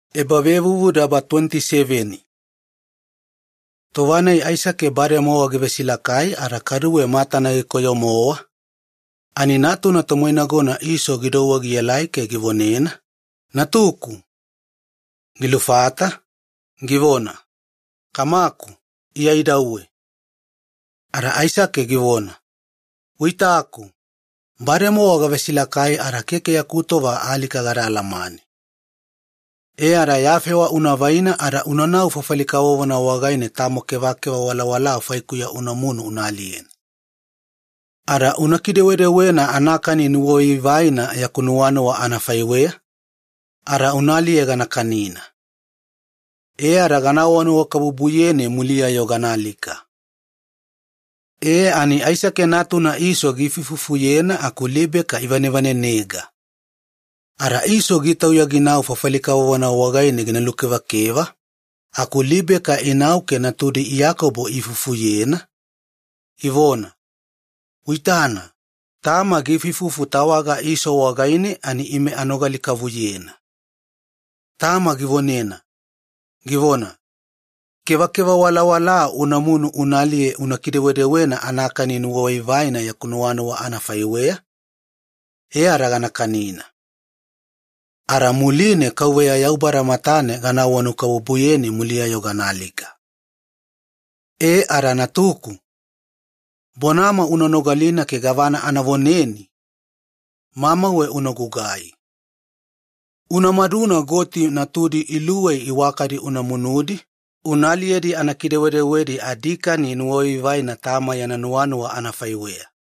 Aisake yana vonadabadaba anavonanuwakabubu Iyakobo givaina. Tova-nai Aisake bademowa givesilakai ada kaduwe matana gikoyo, ada natuna tomoinagona Iso gidouwe gielai ke givonena, “Natuku.” Gilufata, givona, “Iya idauwe, kamaku.” Ada Aisake givona, “Uitana, bademowa gavesilakai ada keke yaku tova alika gada alamane. E ada ya fewa ke ya tufi wafosena unavaidi ada unanau fafali kavovona wagaine tamo kevakeva walawalaa faikuya unamunu una aliyena. Ada una kidewedewena anakani nuwavaivaina yaku nuwanuwa anafaiweya ada una aliye ganakani, e ada vonanuwakabubu gana veleni aku muliya ganaalika.” E, Aisake natuna Iso giifuifufuyena aku Libeka ivanevanenega. Ada Iso gitauya ginau fafali kavovona wagaine gina lukevakeva, aku Libeka inau ke natudi Iyakobo iifufuyena, ivona, “Uitana, tama givonevonena tawaga Iso ani ime anogali-kavuyena. Tama givonena vaita kevakeva walawalaa ginamunu gina aliye gina kidewedewena anakani nuwavaivaina tama yana nuwanuwa anafaiweya ada ginanauwe ginavele ginakani, e ada tawaga gina vonanuwakabubuyena Yaubada matane aku muliya ginaalika. E ada natuku, bonama una nogalina ke gavana anavoneni mamauwe unagugai. Ada unamaduna goti natudi luwei iwakadi una munudi una aliyedi anakidewedewedi adikani nuwavaivaina tama yana nuwanuwa anafaiweya.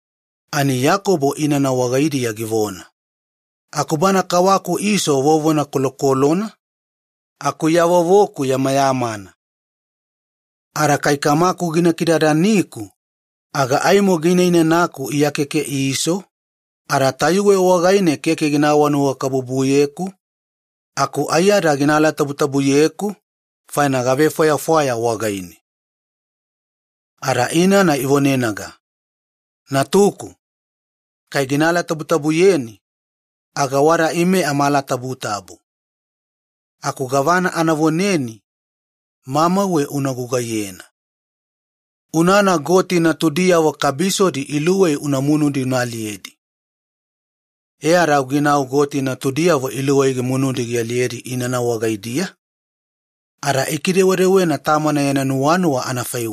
Ani Iyakobo inana wagaidiya givona, “Aku bana kawaku Iso vovona kolokolona, aku iya vovoku keke kolo, vovo-moeku. Ada kai kamaku gina kidadaniku, aga aimo gina inanaku iya keke Iso, ada tayuwe wagaine keke gina vonanuwakabubuyeku aku aiyada gina alatabutabuyeku faina gavefwayafwaya wagaine.” Ada inana ivonenaga, “Natuku, kai gina alatabutabuyeni aga wada ime amaalatabutabu, aku gavana anavoneni mamauwe una gugaiyena. Unana goti natudiyavo kabisodi luwei una munudi una aliyedi.” E ada au ginau goti natudiyavo iluwei gimunudi gialiyedi inana wagaidiya, ada ikidewedewena anafaiweya tamana yana nuwanuwa.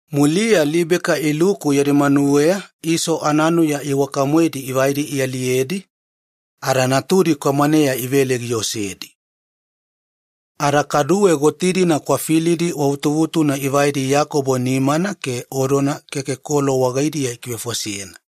Muliya Libeka iluku yadi manuweya Iso ananuya iwakadi ivai ialiyedi, ada natudi kwamaneya ivele giosedi. Ada kaduwe goti-dina kwafilidi wavutuvutuna ivaidi Iyakobo nimana ke odona keke kolo wagaidiya ikivefosena.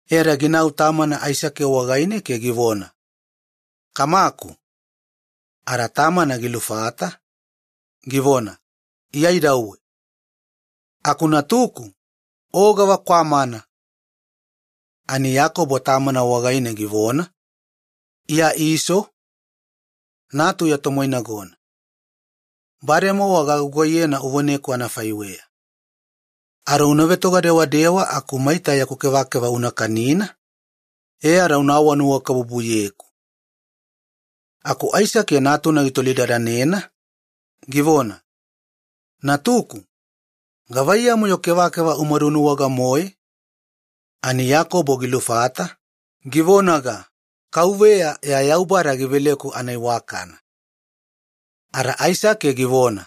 Ada ginau tamana Aisake wagaine ke givona, “Kamaku.” Ada tamana gilufata, givona, “Iya idauwe natuku, aku o gavakwamana?” Ani Iyakobo tamana wagaine givona, “Iya Iso, natu ya tomoinagona. Bademowa gagugaiyena uvoneku anafaiweya. Ada unatoga dewadewa maita yaku kevakeva una kanina, ke ya vonanuwakabubu una veleku.” Aku Aisake natuna gitolidadanena, givona, “Natuku, gavaiyamu-yo kevakeva umadunuwaga-moe?” Ani Iyakobo gilufata, givonaga, “Kauveya ya Yaubada giveleku anaiwakana.” Ada Aisake givona,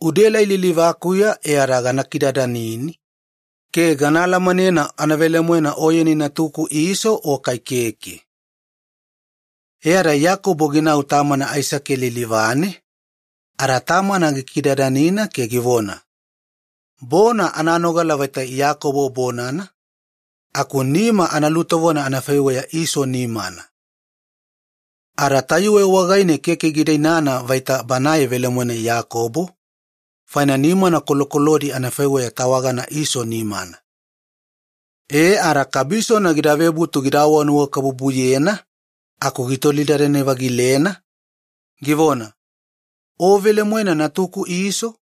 “Unaelai lilivakuya ada gana kidadanini ke gana alamanena anavelemoena oyeni natuku Iso o kai keke.” E ada Iyakobo ginau tamana Aisake lilivane ada tamana gikidadanina ke givona, “Bona ananogala vaita Iyakobo bonana aku nima analutovona anafaiweya Iso nimana.” Ada tayuwe wagaine keke gida inana vaita banae velemoena Iyakobo, faina nimana kolokolodi anafaiweya tawagana Iso nimana. E ada kabisona gida vebutu gida vonanuwakabubuyena aku gitolidadane-vagilena, givona, “O velemoena natuku Iso?”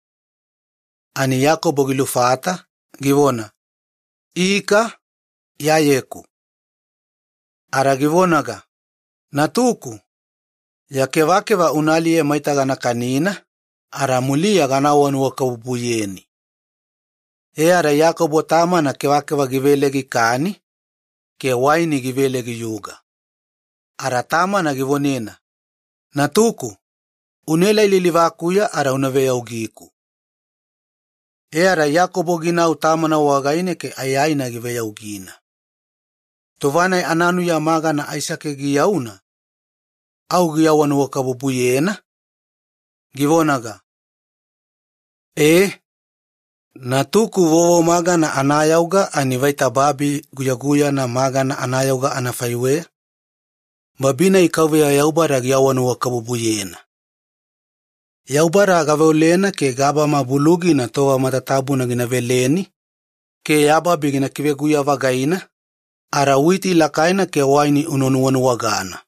Ani Iyakobo gilufata, givona, “Ika, iyayeku.” Ada givonaga, “Natuku, ya kevakeva una aliye maita gana kanina, muliya gana vonanuwakabubuyeni.” E ada Iyakobo tamana kevakeva givele gikani, ke waini givele giyuga. Ada tamana givonena, “Unaelai lilivakuya ada una veyaugiku.” Ada Iyakobo ginau tamana wagaine ke aiyaina giveyaugina. Tova-nai ananuya magana Aisake giyauna, au givonanuwakabubuyena ada givona, “Ee, natuku vovomagana anayauga anafaiweya fafali guyaguyana magana anayauga Yaubada yana nuwakabubuya. Yaubada gaveolena ke gabama bulugina tova matatabuna gina veleni ke ya babi gina kiveguya-vagaina ada una nuwanuwagana witi lakaina ke waini evaguna.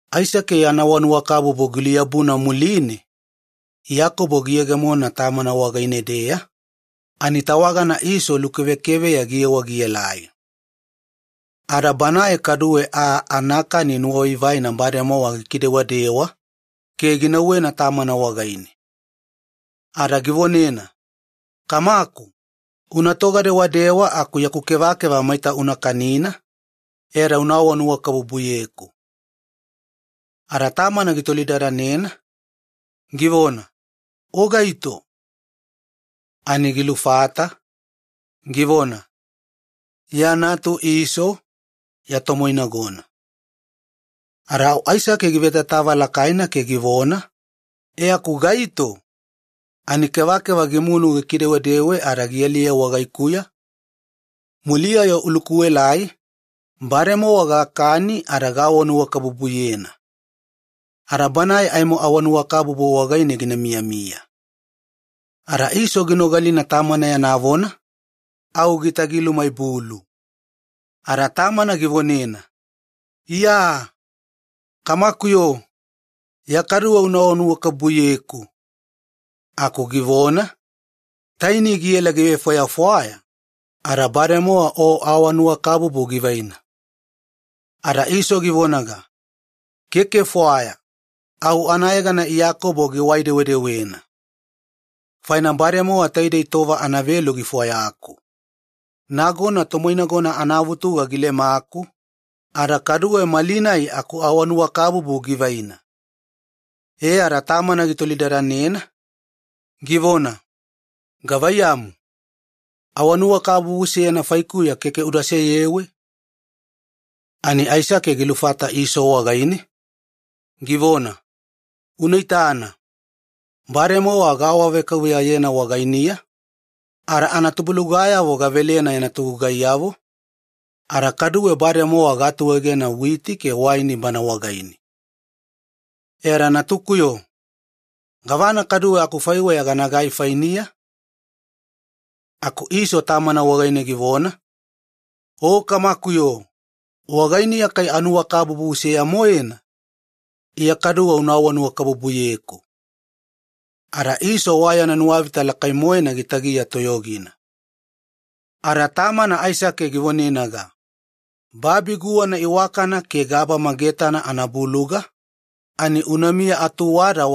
Aisake yana vonanuwakabubu giluyabuna muline, Iyakobo giyegemona tamana wagaine-deya, ani tawagana Iso lukevekeveya giyewa gielai. Ada banae kaduwe aa anakani nuwavaivaina bademowa gikidewadewa, ke ginauwena tamana wagaine. Ada givonena, “Kamaku, unatoga dewadewa aku yaku kevakeva maita una kanina, ke una vonanuwakabubuyeku.” Ada tamana gitolidadanena, givona, “O gaito?” Ani gilufata, givona, “Iya natu Iso, ya tomoinagona.” Ada au Aisake givetatava lakaina ke givona, “Aku gaito, ani kevakeva gimunu gikidewedewe ada gialiye wagaikuya? Muliya-yo ulukuelai, bademowa gakani ada gavonanuwakabubuyena. Ada banae aimo vonanuwakabubu wagaine gina miyamiya.” Ada Iso ginogalina tamana yana vona, au gitagilumaibulu ada tamana givonena, “Iya! Kamakuyo, Iya kaduwe unavona nuwakabubuyeku.” Aku givona, “Keke akufaiweya. Taini giela givefwayafwaya, ada avonanuwakabubu givaina.” Ada Iso givonaga, “Keke fwaya, au anayegana Iyakobo giwai-dewedewena. Bademowa taidei tova anavelu gifwayaku. Nagona tomoinagona anavutuga gilemaku, ada kaduwe malinai akuvonanuwakabubu givaina.” E ada tamana gitolidadanena, givona, “Keke tamo faikuya gava vonanuwakabubu uda seyewe?” Ani Aisake gilufata Iso wagaine, givona, “Uitana, bademowa gaawavekauveyayena wagainiya, ke anatubulugayavo matatabuna anafaiweya yana togugaiyavo, ada kaduwe bademowa gaatuegena witi ke waini wagaine. Ada keke tamo gavana gidatufo ke ganagai fainiya.” Aku Iso tamana wagaine givona, “O kamakuyo, wagainiya kai vonanuwakabubu seya-moena? Iya kaduwe uda vonanuwakabubuyeku!” Ada Iso gitagiya moiyalina. Ada tamana Aisake givonenaga, “Babi guwana iwakana ke gabama getana anabuluga wagaidiya-deya aimo unamiya atuwada.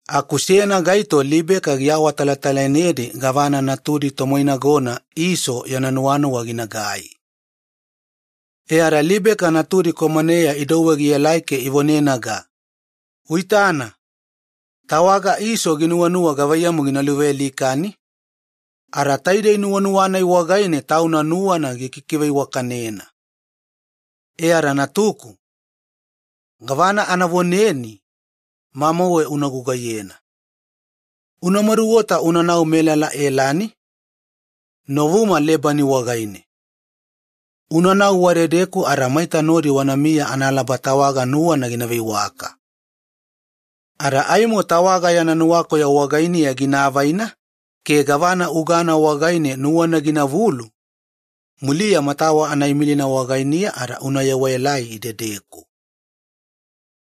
Aku seyana gaito Libeka giawatalatalainedi gavana natudi tomoinagona Iso yana nuwanuwa ginagai. Ada Libeka natudi kwamaneya idouwe gielai ke ivonenaga, “Unaitana, tawaga Iso ginuwanuwa gavaiyamu gina luvealikani, ada taidei nuwanuwa-nai wagaine tauna nuwana gikikiveiwakanena. E ada natuku, gavana anavoneni mamauwe unagugai. Una maduota unanau Elani novuma Lebani wagaine. Unanau wadedeku ada maita nodi wanamiya analaba tawaga nuwana gina veiwaka. Ada aimo tawaga yana nuwakoyo wagainiya gina avaina ke gavana ugana wagaine nuwana ginavulu, muliya matawa ana imilina wagainiya ada una yewaelai idedeku.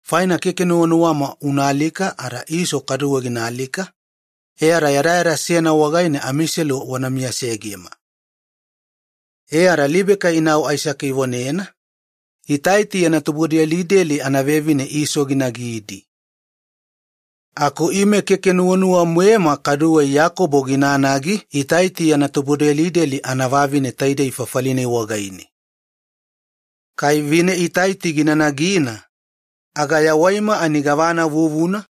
Faina keke nuwanuwama unaalika ada Iso kaduwe ginaalika, e ada yadayada seyana wagaine amiselu wana miyasegema.” E ada Libeka inau Aisake ivonena, “Itaiti yana tubudelideli anavevine Iso ginagidi. Aku ime keke nuwanuwa-moema kaduwe Iyakobo ginanagi Itaiti yana tubudelideli anavavine taidei fafali-nai wagaine. Kai ginanagi aga tunutunugi-moena anaalika.”